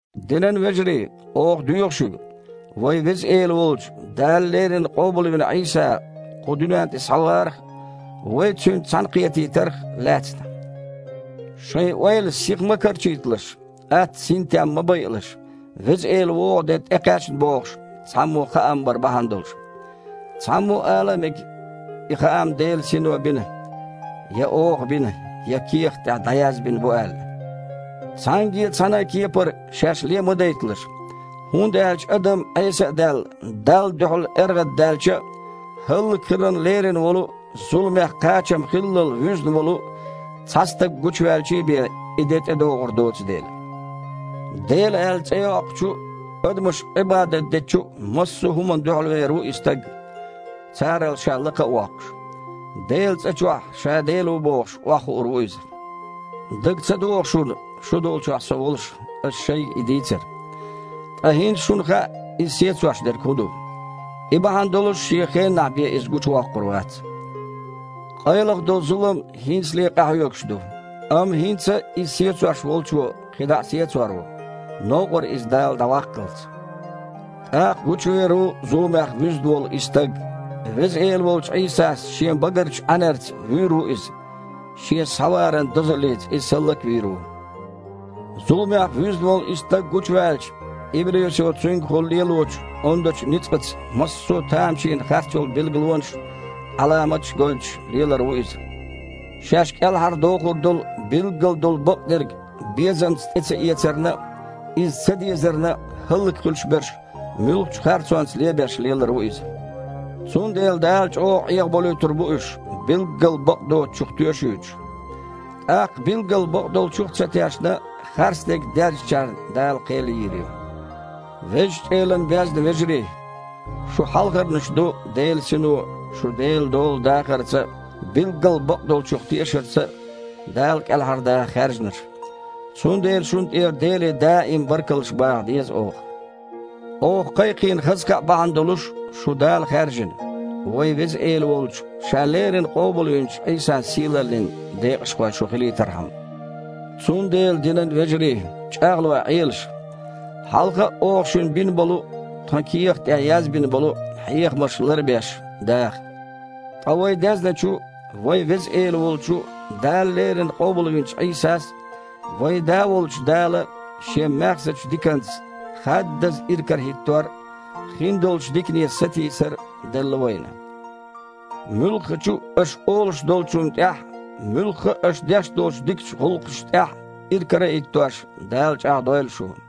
Динан вежарий! Оха доьху шуьга вайн Веза Эла волчу Дала леррина къобалвина Іийса кху дуьнен тІе схьаварах а, вай Цуьнца цхьаьнакхетийтарх а лаьцна: шайн ойла сиха ма карчийталаш, атта синтем ма байалаш, Веза Эла вогІу де тІекхаьчна бохуш, цхьаммо хаам бар бахьана долуш. Цхьаммо ала мега, и хаам Делан Сино бина, я оха бина, я кехат тІехь дІаязбина бу аьлла. Цхьаьнгге а цхьана а кепара шаьш ле ма дайталаш, хІунда аьлча адам, Іеса а даьлла, Далла дуьхьал эргІаддаьлча а, хІаллакьхиларна лерина волу а, зуламех кхачам хиллал вуьзна волу а цхьа стаг гучуваьлчий бен, и де тІедогІур доцу дела. «Дела» аьлла, цІе йоккхучу а, адамаша Іибадат дечу а массо а хІуманна дуьхьалвер ву и стаг, царал ша лакха а воккхуш. Делан цІа чохь, ша дела ву бохуш, охьахуур ву иза. Дага ца догІу шуна, шу долчохь со волуш, аса шайга и дийцар? Ткъа хІинца шуна хаьа, иза сецош дерг хІун ду. И бахьана долуш шен хеннахь бен иза гучувоккхур вац. Къайлаха долу зулам хІинцале а къахьоьгуш ду. Амма хІинца а иза сецош волчо кхин дІа а сецор ву, новкъара иза Дала дІаваккхалц. ТІаккха гучувер ву зуламех вуьзна волу и стаг. Веза Эла волчу Іийсас Шен багарчу Іаьнарца вуьйр ву иза, Шен схьаваран дозаллица иза хІаллак а вийр ву. Зуламех вуьзна волу и стаг гучуваьлча, иблисо цуьнгахула лелочу ондачу ницкъаца массо а тамашийна харцйолу билгалонаш а, Іаламаташ а гойтуш лелар ву иза. Шаьш кІелхьардохур долу билггал долу бакъдерг безамца тІе ца эцарна а, иза ца дезарна а хІаллакьхуьлуш берш муьлххачу а харцонца лебеш лелар ву иза. Цундела Дала чІогІа Іехаболуьйтур бу уьш, билггал бакъдоцучух тоьшуьйтуш. ТІаккха билггал бакъдолчух а ца тешна, харцдерг дезначарна Дала кхел йийр ю. Везачу Элана безна вежарий! Шу хьалхарнаш ду Делан Сино шу Делан дола дахарца а, билггал бакъдолчух тешарца а Дала кІелхьардаха хаьржинарш. Цундела шуна тІера Деле даим баркаллаш баха деза оха. Оха кхайкхийна хаза кхаъ бахьана долуш шу Дала хаьржина, вайн Веза Эла волчу, Ша леррина къобалвинчу Іийсан сийлаллин декъашхой шу хилийтархьама. Цундела, динан вежарий, чІагІлой Іелаш. Хьалха а оха шуна бина болу а, тхан кехат тІехь язбина болу а хьехамаш лар а беш, даха. Ткъа вай дезначу, вайн Веза Эла волчу, Дала леррина къобалвинчу Іийсас а, вайн Да волчу Дала а Шен маьхзачу диканца хаддаза иракарахІиттор а, хиндолчу дикане сатийсар а делла вайна. Муьлххачу а аша олуш долчунна тІехь а, муьлхха а аша деш долчу дикачу гІуллакхашна тІехь а, иракара а хІиттош, Дала чІагІдойла шу.